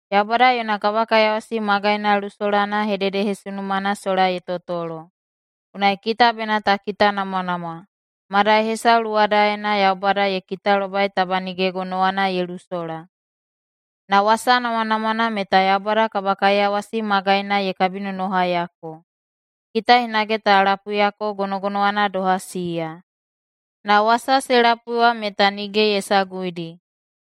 Yaubada yona kabakaiyawasi magaina lusolana hededehesunumana sola ye totolo, unai kita bena ta kitanamwanamwa, madai hesau luwadaena Yaubada ye kitalobai taba nige gonowana ye lusola. Na wasa namwanamwana meta Yaubada kabakaiyawasi magaina ye kabinonohaiyako, kita hinage ta lapuiyako gonogonowana doha siya. Na wasa se lapui wa meta nige ye saguidi,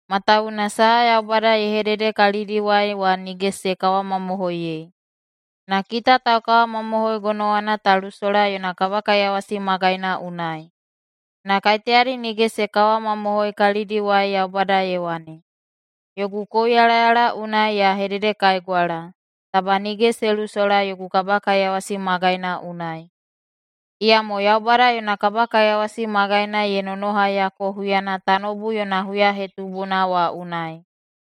matawuwuna saha Yaubada ye hedede kalidiwai wa nige se kawamamohoiyei. Na kita taukawamamohoi gonowana ta lusola yona kabakaiyawasi magaina unai. Na [kaiteyadi nige se kawamamohoi, kalidiwai] Yaubada ye wane, “Yogu kouyalayala unai ya hededekaigwala, ‘Taba nige se lusola yogu kabakaiyawasi magaina unai.’” Iyamo Yaubada yona kabakaiyawasi magaina ye nonohaiyako huyana tanoubu yona huyahetubuna wa unai.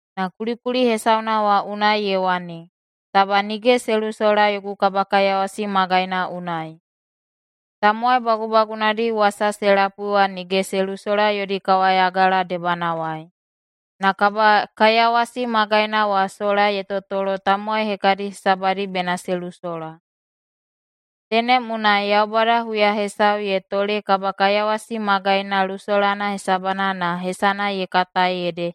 Na kulikuli hesauna wa unai ye wane, “Taba nige se lusola yogu kabakaiyawasi magaina unai.” Tamowai bagubagunadi wasa se lapui wa nige se lusola yodi kawayagala debanawai, na kabakaiyawasi magaina wa sola ye totolo tamowai hekadi hesabadi bena se lusola. Tenem unai Yaubada huya hesau ye tole kabakaiyawasi magaina lusolana hesabana na hesana ye katai ede,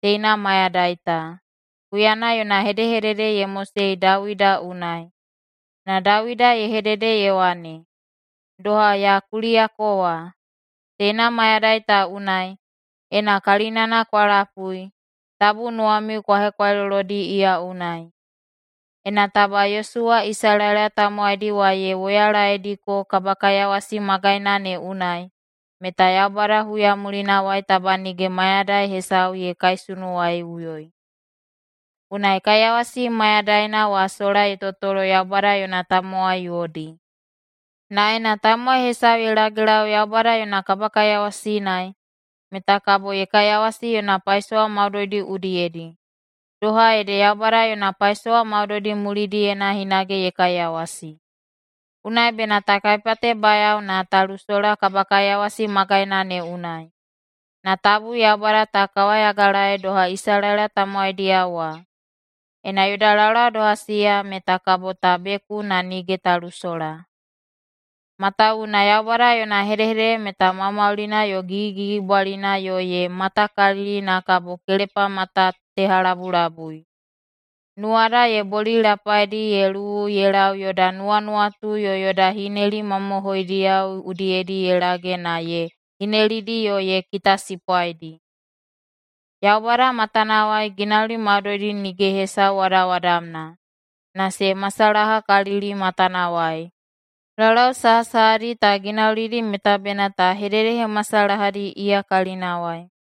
“Teina mayadai ta”, huyana yona hedehedede ye mosei Dawida unai. Na Dawida ye hedede ye wane, doha ya kuliyako wa: “Teina mayadai ta unai, ena kalinana kwa lapui, tabu nuwamiu kwa hekwailolodi iya unai.” Ena taba Yosuwa Isalaela tamowaidi wa ye woyalaediko kabakaiyawasi magaina ne unai, meta Yaubada huya mulinawai taba nige mayadai hesau ye kaisunuwaiꞌuyoi. Unai kaiyawasi mayadaina wa sola ye totolo Yaubada yona tamowai yodi. Na ena tamowai hesau ye lagelau Yaubada yona kabakaiyawasi unai, meta kabo ye kaiyawasi yona paisowa maudoidi udiyedi, doha ede Yaubada yona paisowa maudoidi mulidiyena hinage ye kaiyawasi. Unai bena ta kaipatebayao na ta lusola kabakaiyawasi magaina ne unai, na tabu Yaubada ta kawayagalaei doha Isalaela tamowaidiyao wa. Ena yoda laulau doha siya meta kabo ta beku na nige ta lusola. Matawuwuna Yaubada yona hedehedede meta maumaulina yo gigigigibwalina yo ye matakalili na kabo kelepamatatehalabulabui. Nuwada ye bolilapaidi ye luwu ye lau yoda nuwanuwatu yo yoda hineli mamohoidiyao udiyedi ye lage na ye hinelidi yo ye kitasipwaidi. Yaubada matanawai ginauli maudoidi nige hesau wadawadamna, na se masalahakalili matanawai. Laulau sahasahadi ta ginaulidi meta bena ta hededehemasalahadi iya kalinawai.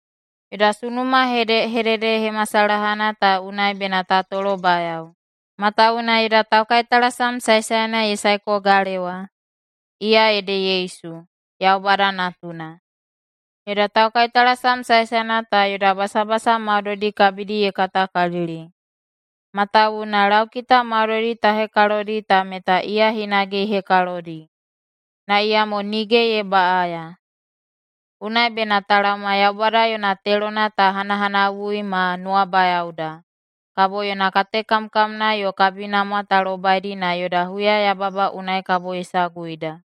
Yoda sunuma hedehededehemasalahana ta unai bena ta tolobayao, matawuwuna yoda taukaitalasam saesaena ye saeko galewa. Iya ede Yesu, Yaubada Natuna. Yoda taukaitalasam saesaena ta yoda basabasa maudoidi kabidi ye katakalili, matawuwuna laukita maudoidi ta hekalodi ta meta iya hinage ye hekalodi. Na iyamo nige ye baꞌaya. Unai bena ta laoma Yaubada yona telona ta hanahanawui ma nuwabayaoda, kabo yona katekamkamna yo kabinamwa ta lobaidi na yoda huyayababa unai kabo ye saguida.